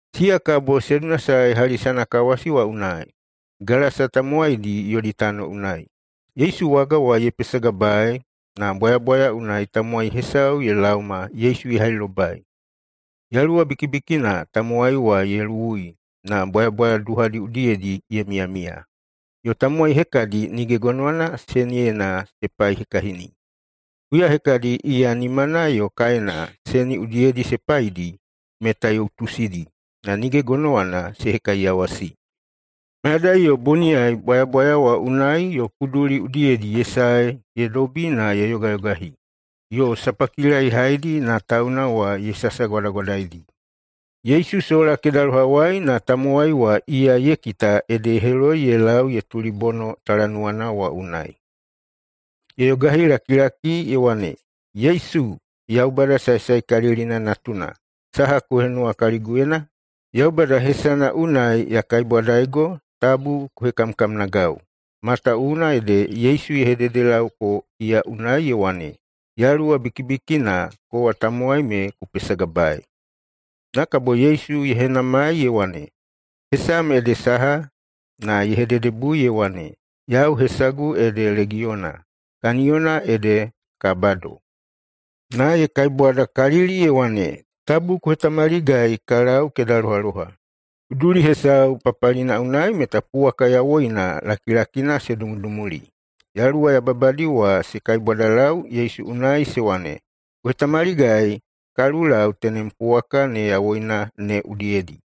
Siya kabo se dunasae hali sanakawasi wa unai, Gelasa tamowaidi yodi tano unai. Yesu waga wa ye pesagabaei, na bwayabwaya unai tamowai hesau ye laoma Yesu ye hailobai. Yaluwa bikibikina tamowai wa ye luwui na bwayabwaya duhadi udiyedi ye miyamiya, yo tamowai hekadi nige gonowana seniyena se paihekahini. Huya hekadi iya nimana yo kaena seni udiyedi se paidi, meta ye utusidi, na nige gonowana se hekaiyawasi. Mayadai yo boniyai bwayabwaya wa unai yo kuduli udiyedi ye sae ye dobi na ye yogayogahi, yo sapakila ye haidi na tauna wa ye sasagwadagwadaidi. Yesu sola kedalohawai na tamowai wa iya ye kita ede ye heloi ye lau ye tulibono talanuwana wa unai. Ye yogahilakilaki ye wane, “Yesu, Yaubada Saesaekalilina natuna, saha ku henuwa kaliguyena? Yaubada hesana unai ya kaibwadaigo tabu ku hekamkamnagau.” Matawuwuna ede Yesu ye hededelauko iya unai ye wane, “Yaluwa bikibikina, kowa tamowai me ku pesagabaei.” Na kabo Yesu ye henamai ye wane, “Hesam ede saha?” Na ye hededebui ye wane, “Yau hesagu ede Legiyona, kaniyona ede ka bado.” Na ye kaibwadakalili ye wane, “Tabu ku hetamaligai ka lau kedalohaloha.” Kuduli hesau papalina unai meta puwaka yawoina lakilakina se dumudumuli. Yaluwa yababadi wa se kaibwadalau Yesu unai se wane, “Ku hetamaligai ka lulau tenem puwaka ne yawoina ne udiyedi.”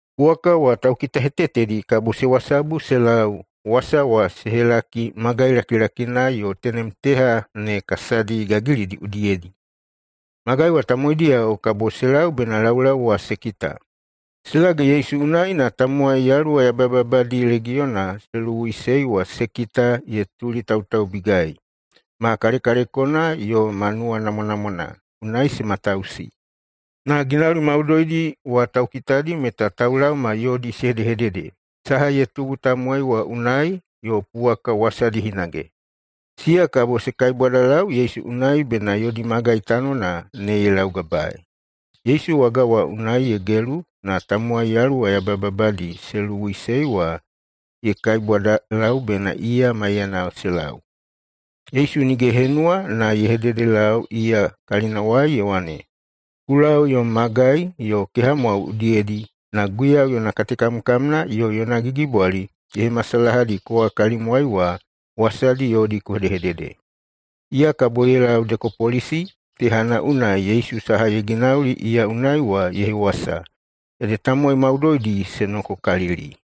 Puwaka wa taukitahetetedi kabo se wasabu se lau, wasa wa se helaki magai lakilakina yo tenem teha ne kasadi gagilidi udiyedi. Magai wa tamowaidiyao kabo se lau bena laulau wa se kita. Se lage Yesu unai na tamowai yaluwa yabayababadi legiyona se luwuiꞌusei wa se kita ye tulitautaubigai, ma kalekalekona yo ma nuwanamwanamwana. Unai se matausi. Na ginauli maudoidi wa taukitadi meta taulaoma yodi se hedehedede, saha ye tubu tamowai wa unai, yo puwaka wasadi hinage. Siya kabo se kaibwadalau Yesu unai bena yodi magai tanona ne ye laugabaei. Yesu waga wa unai ye gelu, na tamowai yaluwa yababadi se luwuiꞌusei wa ye kaibwadalau bena iya maiyana se lau. Yesu nige ye henuwa na ye hededelau iya kalinawai ye wane, “Ku lau yom magai yo kehamwao udiyedi na Guiyau yona katekamkamna yo yona gigibwali ye hemasalahadi kowa kalimwai wa, wasana yodi ku hedehedede.” Iya kabo ye lau Dekapolisi tehana unai Yesu saha ye ginauli iya unai wa ye hewasa, ede tamowai maudoidi se nokokalili.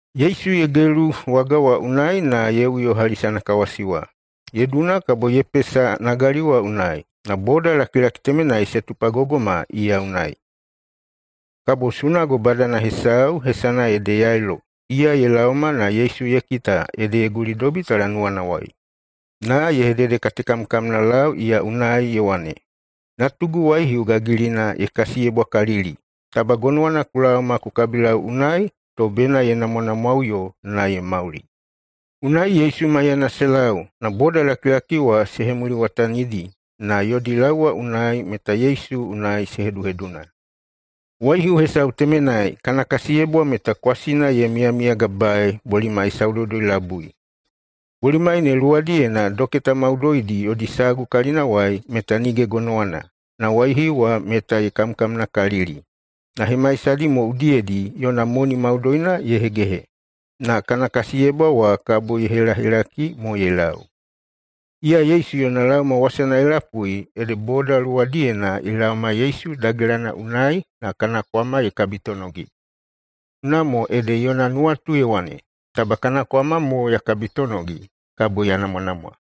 Yesu ye gelu waga wa unai na ye uyo hali sanakawasi wa. Ye duna kabo ye pesa nagali wa unai, na bodalakilaki temenai se tupagogoima iya unai. Kabo sunago badana hesau, hesana ede Yailo, iya ye laoma na Yesu ye kita ede ye gulidobi talanuwanawai. Na ye hededekatekamkamnalau iya unai, ye wane, “Natugu waihiu gagilina ye kasiyebwakalili. Taba gonowana ku laoma ku kabilau unai to bena ye namwanamwaꞌuyo na ye mauli.” Unai Yesu maiyana se lau, na bodalakilaki wa se hemuliwatanidi na yodi lau wa unai meta Yesu unai se heduheduna. Waihiu hesau temenai, kana kasiyebwa meta kwasina ye miyamiyagabaei bolimai saudoudoi-labui. Bolimai ne luwadiyena doketa maudoidi yodi sagu kalinawai meta nige gonowana, na waihiu wa meta ye kamkamnakalili. Na hemaisadi mo udiyedi yona moni maudoina ye hegehe, na kana kasiyebwa wa kabo ye helahelaki mo ye lau. Iya Yesu yona laoma wasana ye lapui ede boda luwadiyena ye laoma Yesu dagelana unai na kana kwama ye kabitonogi, unamo ede yona nuwatu ye wane, “Taba kana kwama mo ya kabitonogi, kabo ya namwanamwa.”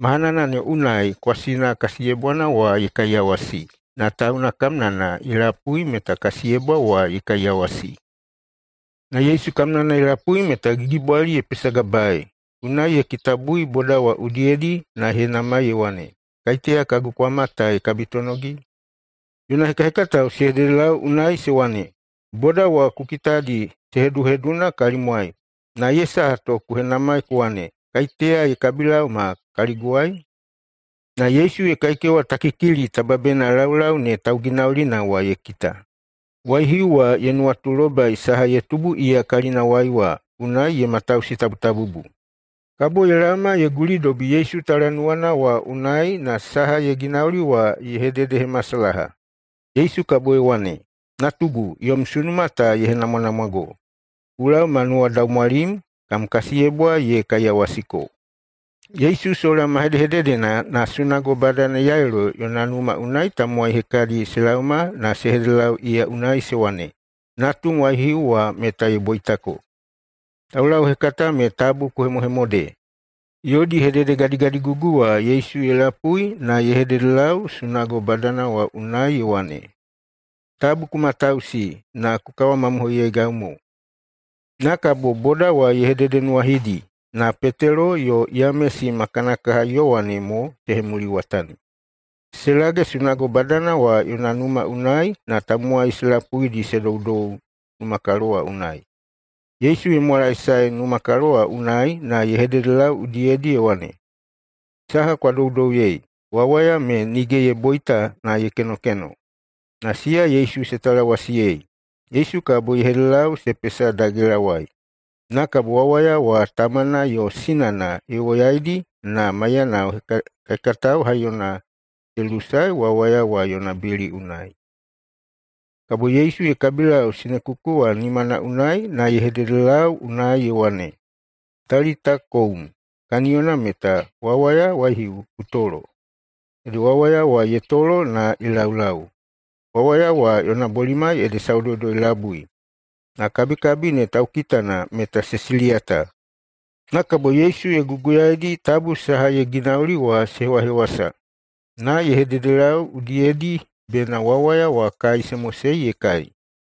Mahanana ne unai kwasina kasiyebwana wa ye kaiyawasi, na tauna kamnana ye lapui meta kasiyebwa wa ye kaiyawasi. Na Yesu kamnana ye lapui meta gigibwali ye pesagabaei, unai ye kitabui boda wa udiyedi na ye henamai ye wane, “Kaiteya kagu kwama ta ye kabitonogi?” Yona hekahekatao se hededelau unai se wane, “Boda wa ku kitadi se heduheduna kalimwai, na ye saha to ku henamai ku wane, ‘Kaiteya ye kabilaoma kaliguwai?’” Na Yesu ye kaikewatakikili taba bena laulau ne tauginaulina wa ye kita. Waihiu wa ye nuwatulobai saha ye tubu iya kalinawai wa, unai ye matausitabutabubu. Kabo ye laoma ye gulidobi Yesu talanuwana wa unai na saha ye ginauli wa ye hededehemasalaha. Yesu kabo ye wane, “Natugu, yom sunuma ta ye henamwanamwago. Ku lau ma nuwadaumwalim, kam kasiyebwa ye kaiyawasiko.” Yesu sola ma hedehededena na sunago badana Yailo yona numa unai tamowai hekadi se laoma na se hededelau iya unai se wane, “Natum waihiu wa meta ye boitako! Taulauhekata me tabu ku hemohemode.” Yodi hededegadigadigugu wa Yesu ye lapui na ye hededelau sunago badana wa unai ye wane, “Tabu ku matausi, na ku kawamamohoiyeigau mo.” Na kabo boda wa ye hededenuwahidi, na Petelo yo Yamesi ma kana kaha Yowane mo se hemuliwatani. Se lage sunago badana wa yona numa unai na tamowai se lapuidi se doudou numakalo wa unai. Yesu ye mwalaesae numakalo wa unai na ye hededelau udiyedi ye wane, “Saha kwa doudouyei? Wawaya me nige ye boita na ye kenokeno.” Na siya Yesu se talawasiyei. Yesu kabo ye hedede se pesa dagelawai, na kabo wawaya wa tamana yo sinana ye woyaidi na maiyana hekahekatao haiyona wa se lusae wawaya wa yona bili unai. Kabo Yesu ye kabilau sinekuku wa nimana unai na ye hededelau unai ye wane, “Talita koum!”, kaniyona meta, “Wawaya waihiu, ku tolo!” Ede wawaya wa ye tolo na ye laulau. Wawaya wa yona bolimai ede saudoudoi-labui. Na kabikabi ne taukitana meta se siliyata. Na kabo Yesu ye guguyaedi tabu saha ye ginauli wa se hewahewasa, na ye hededelau udiyedi bena wawaya wa kai se mosei ye kai.